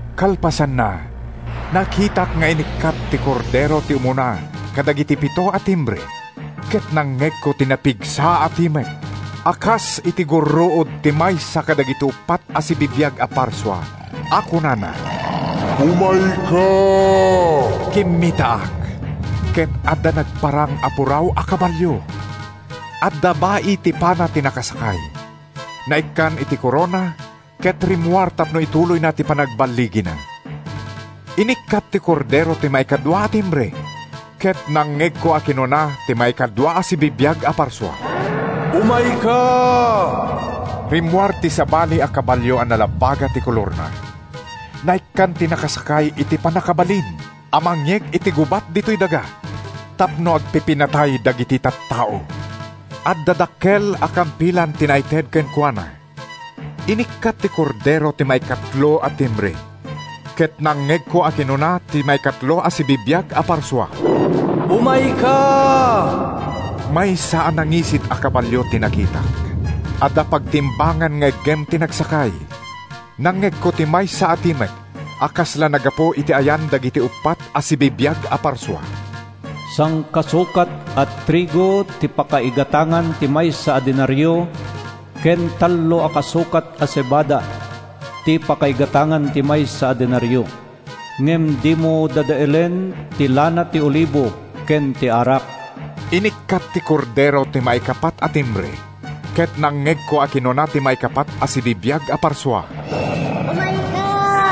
Kalpasanna, nakitak nga inikkat ti Kordero ti umuna kadagiti pito a timbre ket nangngegko ti napigsa a timek a kas iti gurruod ti maysa kadagiti uppat a sibibiag a parsua a kunana, “Umayka!” Kimmitaak, ket adda nagparang a puraw a kabalio. Adda bai ti pana ti nakasakay. Naikkan iti korona ket rimmuar tapno ituloyna ti panagballigina. Inikkat ti Kordero ti maikadua a timbre, ket nangngegko a kinuna ti maikadua a sibibiag a parsua, “Umayka!” Rimmuar ti sabali a kabalio a nalabaga ti kolorna. Naikkan ti nakasakay iti pannakabalin a mangyeg iti gubat ditoy daga tapno agpipinnatay dagiti tattao. Adda dakkel a kampilan ti naited kenkuana. Inikkat ti Kordero ti maikatlo a timbre, ket nangngegko a kinuna ti maikatlo a sibibiag a parsua, “Umayka!” Maysa a nangisit a kabalio ti nakitak. Adda pagtimbangan nga iggem ti nagsakay. Nangngegko ti maysa a timek a kasla naggapu iti ayan dagiti uppat a sibibiag a parsua: “Sangkasukat a trigo ti pakaigatangan ti maysa a denario, ken tallo kasukat a sebada ti pakaigatangan ti maysa a denario. Ngem dimo dadaelen ti lana ti olibo ken ti arak!” Inikkat ti Kordero ti maikapat a timbre, ket nangngegko a kinuna ti maikapat a sibibiag a parsua, “Umayka!”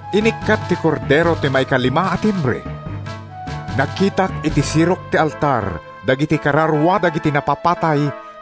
Inikkat ti Kordero ti maikalima a timbre. Nakitak iti sirok ti altar dagiti kararua dagiti napapatay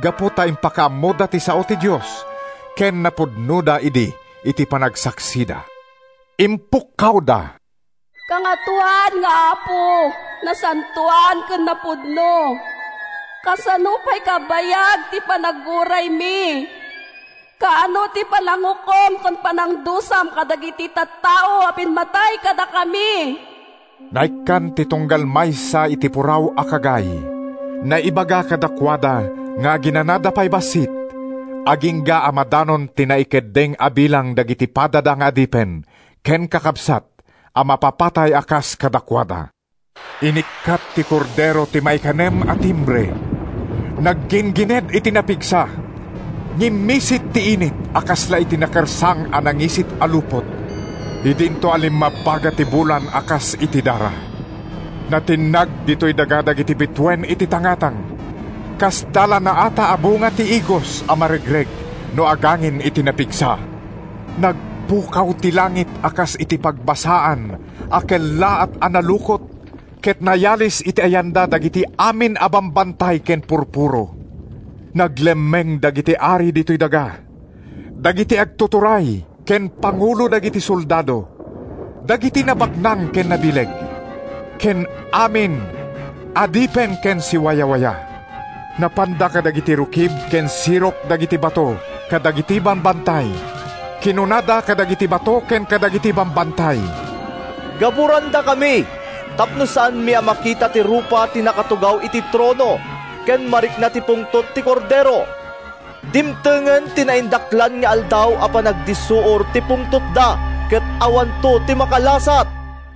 gapu ta impakaammoda ti sao ti Dios ken napudnoda idi iti panagsaksida. Impukkawda, “Kangatoan nga Apo, nasantoan ken napudno! Kasano pay kabayag ti panaguraymi? Kaano ti panangukom ken panangdusam kadagiti tattao a pimmatay kadakami?” Naikkan ti tunggal maysa iti puraw a kagay. Naibaga kadakuada nga aginanada pay bassit agingga a madanon ti naikeddeng a bilang dagiti padada nga adipen ken kakabsat a mapapatay a kas kadakuada. Inikkat ti Kordero ti maikanem a timbre. Nagginggined iti napigsa. Ngimmisit ti init a kasla iti nakersang a nangisit a lupot idinto a limmabbaga ti bulan a kas iti dara. Natinnag ditoy daga dagiti bituen iti tangatang. Kasda la naata a bunga ti igos a maregreg no agangin iti napigsa. Nagpukaw ti langit a kas iti pagbasaan a kellaat a nalukot ket nayalis iti ayanda dagiti amin a bambantay ken purpuro. Naglemmeng dagiti ari ditoy daga, dagiti agtuturay ken pangulo dagiti soldado, dagiti nabaknang ken nabileg, ken amin, adipen ken siwawaya. Napanda kadagiti rukib ken sirok dagiti bato kadagiti bambantay. Kinunada kadagiti bato ken kadagiti bambantay: “Gaburandakami tapno saanmi a makita ti rupa ti nakatugaw iti trono ken marikna ti pungtot ti Kordero. Dimtengen ti naindaklan nga aldaw a panagdissuor ti pungtotda ket awanto ti makalasat.”